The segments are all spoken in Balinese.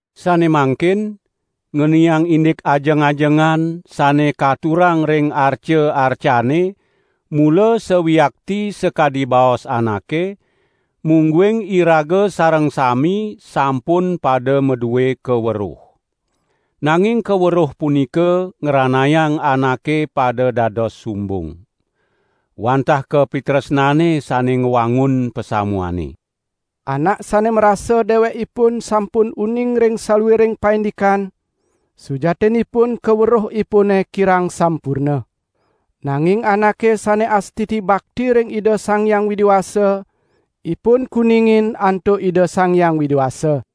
Sane mangkin, ngeniang indik ajeng-ajengan sane katurang ring arca-arcane mula sawiakti sakadi baos anake, mungguing iraga sareng sami sampun pada madue kaweruh. Nanging kaweruh punika ngranayang anake pada dados sumbung. Wantah kapitresnane sane ngwangun pasamuane. Anak sane marasa dewekipun sampun uning ring saluiring paindikan, sujatinipun kaweruhipune kirang sampurna. Nanging anake sane astiti bakti ring Ida Sang Hyang Widi Wasa, ipun kuningin antuk Ida Sang Hyang Widi Wasa.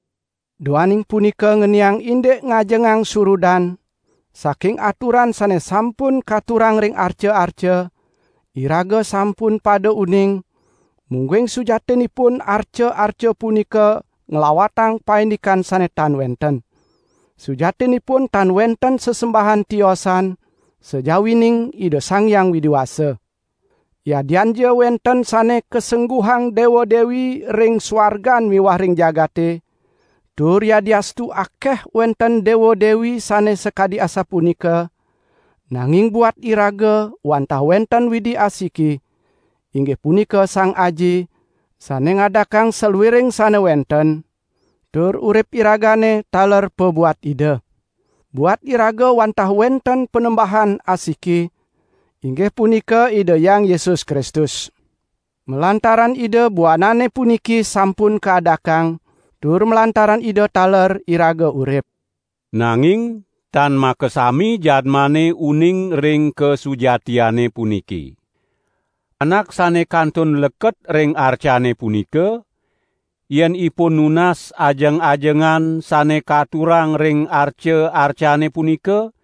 Duaning punika ngeniang indik ngajengang surudan saking aturan sane sampun katurang ring arca-arca, iraga sampun pada uning mungguing sujatinipun arca-arca punika nglawatang paindikan sane tan wenten. Sujatinipun tan wenten sesembahan tiosan, sajawining Ida Sang Hyang Widi Wasa. Yadianja wenten sane kasengguhang dewa-dewi ring suargan miwah ring jagate, tur yadiastu akeh wenten dewa-dewi sane sakadi asapunika, nanging buat iraga wantah wenten Widi asiki, inggih punika Sang Aji, sane ngadakang saluiring sane wenten, tur urip iragane taler pabuat Ida. Buat iraga wantah wenten Panembahan asiki, inggih punika Ida Hyang Yesus Kristus. Malantaran Ida buanane puniki sampun kaadakang, tur malantaran Ida taler iraga urip. Nanging tan makasami jadmane uning ring kasujatiane puniki. Anak sane kantun leket ring arcane punika, yen ipun nunas ajeng-ajengan sane katurang ring arca-arcane punika,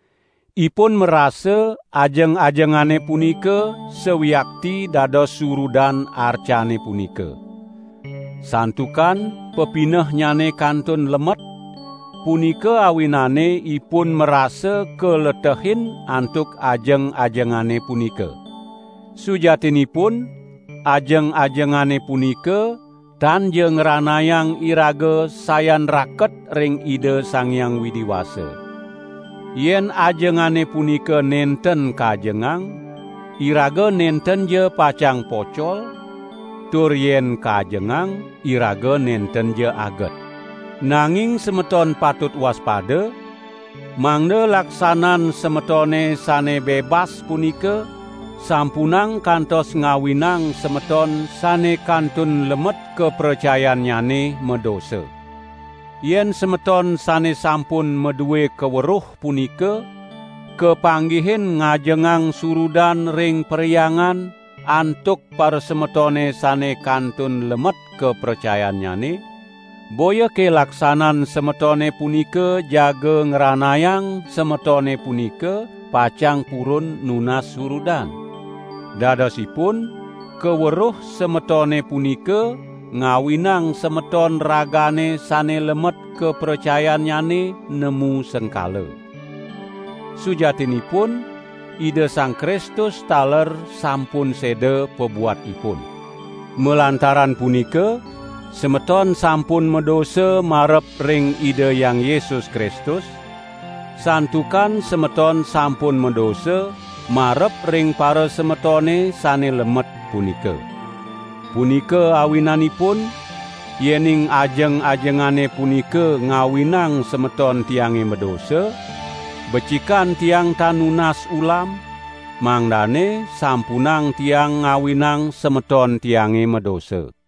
ipun marasa ajeng-ajengane punika sawiakti dados surudan arcane punika. Santukan pepinehnyane kantun lemet, punika awinane ipun marasa kaletehin antuk ajeng-ajengane punika. Sujatinipun ajeng-ajengane punika tanja ngranayang iraga sayan raket ring Ida Sang Hyang Widi Wasa. Yen ajengane punika nenten kajengang, iraga nentenja pacang pocol, tur yen kajengang iraga nentenja aget. Nanging semeton patut waspada, mangda laksanan semetone sane bebas punika sampunang kantos ngawinang semeton sane kantun lemet kapracayannyane madosa. Yen semeton sane sampun madue kaweruh punika, kapanggihin ngajengang surudan ring perhyangan antuk parasemetone sane kantun lemet kapracayannyane, boyake laksanan semetone punika jaga ngranayang semetone punika pacang purun nunas surudan? Dadosipun kaweruh semetone punika ngawinang semeton ragane sane lemet kapracayannyane, nemu sengkala. Sujatinipun Ida Sang Kristus taler sampun seda pabuat ipun. Malantaran punika semeton sampun madosa marep ring Ida Hyang Yesus Kristus, santukan semeton sampun madosa marep ring parasemetone sane lemet punika. Punika awinanipun, yening ajeng-ajengane punika ngawinang semeton tiange madosa, becikan tiang tan nunas ulam, mangdane sampunang tiang ngawinang semeton tiange madosa.